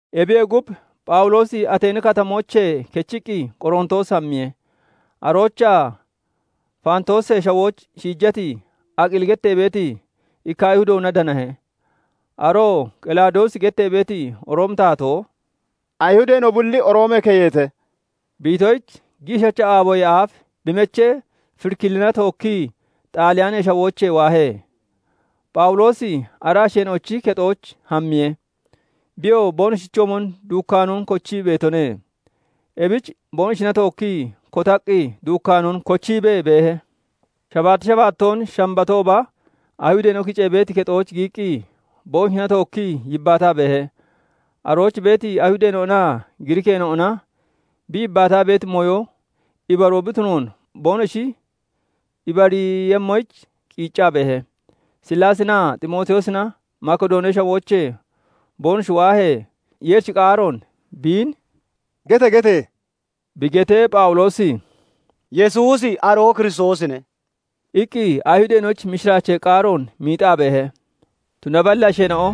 Ebiyee gub, Phawuloosi Ateeni Katamoochee kechiqqi Qorontoos hammiye. Aroochaa Faantoosee Shawooch shiijati Aqili gettee beeti ikka Ayhuudoona danahe. Aroo Qelawudoosi gettee beeti Roomi taatoo "Ayihudeena'o bulli Roomee keyete!" bi itoyich, giishacha aaboyee aaf bi mechee Firikilina tookkii Xaaliyaanee Shawoochee waahe. Phawuloosi ara asheena'ochi kexooch hammiye. Biyoo boonoshichoomon duukkaanoon kochii beetone; ebich boonoshina tookkii kotaqqi duukkaanoon kochiibee beehe. Shabaatti shabaattoon Shambatooba Ayihudeena'o kicee beeti kexooch giyiqqi, boonoshina tookkii yibbaataa beehe; arooch beeti Ayihudeena'onaa Giriikeena'ona bi yibbaataa beeti mooyo ibaroo bi tunoon boonoshi ibariiyemmoyich qiiccaa beehe. Sillaasinaa Ximootiyoosina Makidoonee Shawoochee boonoshi waahee, Yeerichi qaaroon biin "Gete! Gete!" bi getee, Phawuloosi "Yesuusi aroo Kiristoosine" iqqi Ayihudeena'oyich mishiraachee qaaroon miixaa beehe. Tunaballi asheena'o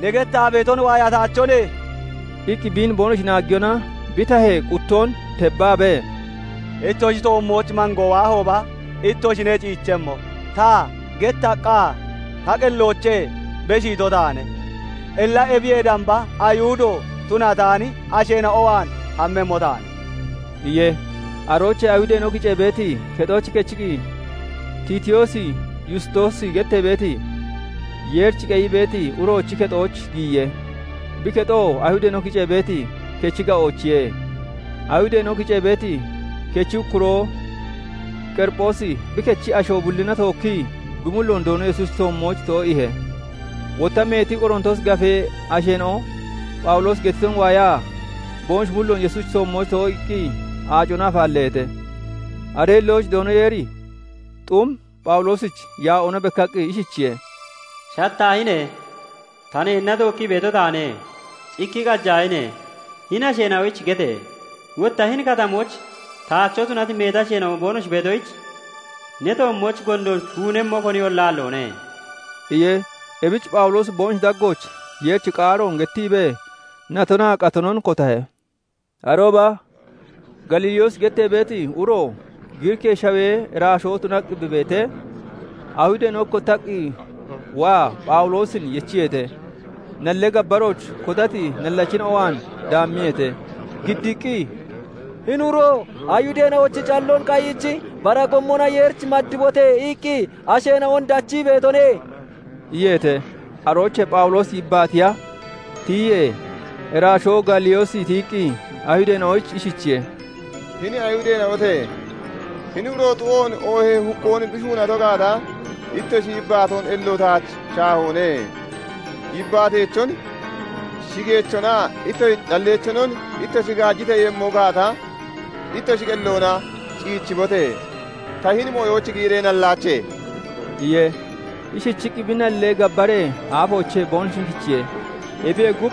"Ne gettaa beeton waayataachone" iqqi biin boonoshi naaggiyona, bi tahee quttoon tebbaabee, "Ittoshi toommooch mangoo waahooba, ittoshine ciichemmo; ta gettaqqa ta qelloochee beshiito taane. Illa ebiyee damba Ayihudo tunataani asheena'o waan hammemmo taane" iye. Aroochee Ayihudeena'o kicee beeti kexoochee kechiqqi, Tiitiyoos Yustoosi gettee beeti, Yeerich qeyii beeti uroochi kexooch giyiye; bi kexoo Ayihudeena'o kicee beeti kechi ga'oochiye. Ayihudeena'o kicee beeti kechi ukkuroo Qeriphoosi bi kechi asho bullina tookkii bi mulloon Doono Yesuusichi toommooch too'iihe. Wotta meeti Qorontoosi Gafee asheena'o Phawuloosi gettiton waayaa, boonoshi mulloon Yesuusichi toommooch too'iiqqi aacona afaalleeheete. Aree hillooch Doono Yeeri xum Phawuloosich yaa'oona bekkaqqi ishichiye:- "Shattaahine! Ta neenna tookkii beeto taane; cikki qajaahine! Hini asheena'oyich gete! Wotta hini katamooch taacho tunati meeti asheena'o boonoshi beetoyich, ne toommooch gondoon shuunemmo koniyolla aalloone!" iye. Ebich Phawuloosi boonoshi daggooch Yeerichi qaaroon gettiibee natonaa qatonon kotahe. Arooba Gaaliyoosi gettee beeti uro Giriikee Shawee iraashoo tunaqqi bi beetee, Ayihudeena'o ikkottaqqi waa Phawuloosin yechiyeete. Nallee gabbarooch kotati nallachina'o waan daammiyeete. Giddiiqqi, "Hini uro 'Ayihudee calloon qayiichi bara gommona Yeerich maddibote!' iqqi asheena'on dachii beetone" iyeete. Aroochee Phawuloosi yibbaatiya tiyiyee, iraashoo Gaaliyoosi tiyiqqi Ayihudeena'oyich ishichiye:- "Hini Ayihudeena'ote! Hini uro xu'oon, oohee hukkoon bi shuunato gaata, ittoshi yibbaatoon ello taach shaahone. Yibbaateechon, shigeechonaa ittoshi calleechonon ittoshi gajiteeyemmo gaata, ittoshi qelloona ciichibote! Ta hini mooyooch giyiree nallaache" iye. Ishichiqqi bi nallee gabbaree aafoochee boonoshin kichiye. Ebiyee gub,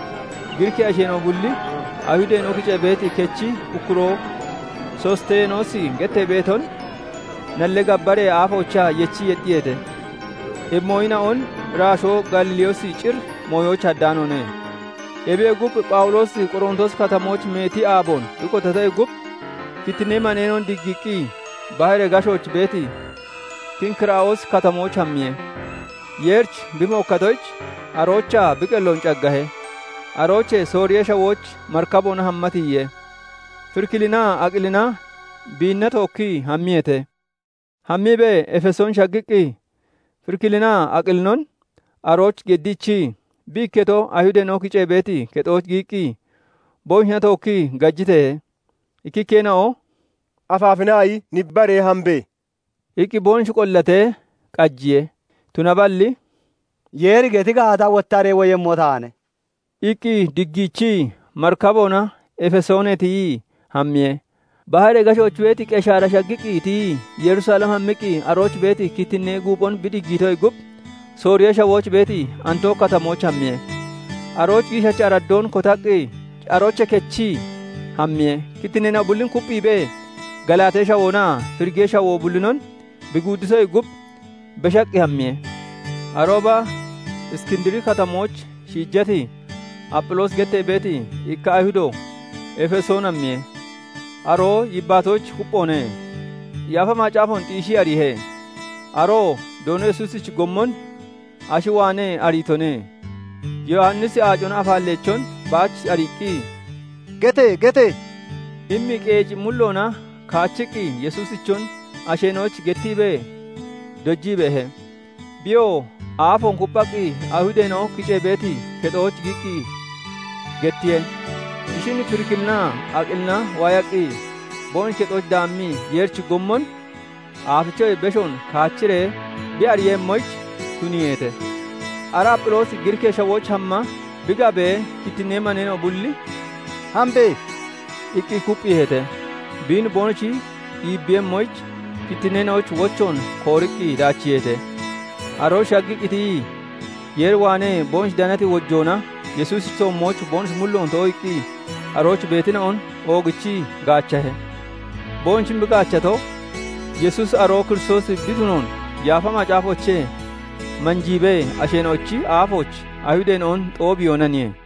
Giriikee asheena'o bulli Ayihudeena'o kicee beeti kechi ukkuroo Sostenoosi gettee beeton nallee gabbaree aafoochaa yechii yexxiyeete. Ebi mooyina'on iraashoo Gaaliyoosi cir mooyooch haddaanoone. Ebiyee gub, Phawuloosi Qoroontoosi Katamooch meeti aaboon bi kotatoyee gub, kittinnee maneena'on diggiiqqi, baharee gashooch beeti Kenkiraa'oosi Katamooch hammiye. Yeerich bi mookkatoyich, aroochaa bi qelloon caggahe. Aroochee Sooriyee Shawooch marikaboona hamma tiyiye. Firikilinaa Aqilina biinna tookkii hammiyeete. Hammiibee Efesoon shaggiqqi, Firikilinaa Aqilinon arooch geddiichii, bi ikketo Ayihudeena'o kicee beeti kexooch giyiqqi, boonoshina tookkii gajiteehe. Ikkikkeena'o "Afaafinaayi nibbaree hambe!" iqqi boonoshi qollatee qajiye; tunaballi "Yeeri geti gaata, wottaree woyemmo taane" iqqi diggiichii, marakiboona Efesoonee tiyii hammiye. Baharee gashooch beeti Qeshaara shaggiqqi tiyii Yerusalem hammiqqi, arooch beeti kittinnee guuphon bi diggiitoyee gub, Sooriyee Shawooch beeti Antooki Katamooch hammiye. Arooch giishacha araddoon kotaqqi, aroochee kechii hammiye. Kittinneena'o bullin kupphiibee, Galaatee Shawoonaa Firigee Shawoo bullinon bi guudditoyee gub, beshaqqi hammiye. Arooba Iskindiri Katamooch shiijati, Apphiloosi gettee beeti ikka Ayihudo Efesoon hammiye. Aroo yibbaatoyich kupphoone. Yaafa Macaafoon xiishii ariihe. Aroo Doono Yesuusichi gommon ashi waanee ariitone; Yowannisi aacona afaalleechon baach ariiqqi, "Gete! Gete!" immi qeeci mulloona kaachiqqi, Yesuusichon asheena'oyich gettiibee dojii beehe. Biyoo aafoon kupphaqqi Ayihudeena'o kicee beeti kexooch giyiqqi gettiye. Ishin Firikilinaa Aqilina waayaqqi, boonoshi kexooch daammii Yeerichi gommon aafichoyee beshoon kaachiree bi ariiyemmoyich tuniiheete. Ara Apphiloosi Giriikee Shawooch hamma bi gabee, kittinnee maneena'o bulli "Hambe!" iqqi kupphiiheete. Biin boonoshi iibbiiyemmoyich, kittinneena'oyich wochoon kooriqqi daachiiheete. Arooch shaggiqqi tiyii, Yeer waanee boonoshi danati wojoona Yesuusichi toommooch boonoshi mulloon too'iiqqi arooch beetina'on oogichii gaachahe. Boonoshin bi gaachato, Yesuusi aroo Kiristoosi bi tunoon Yaafa Macaafoochee manjiibee, asheena'ochi aafooch Ayihudeena'on xoobiyoonaniye.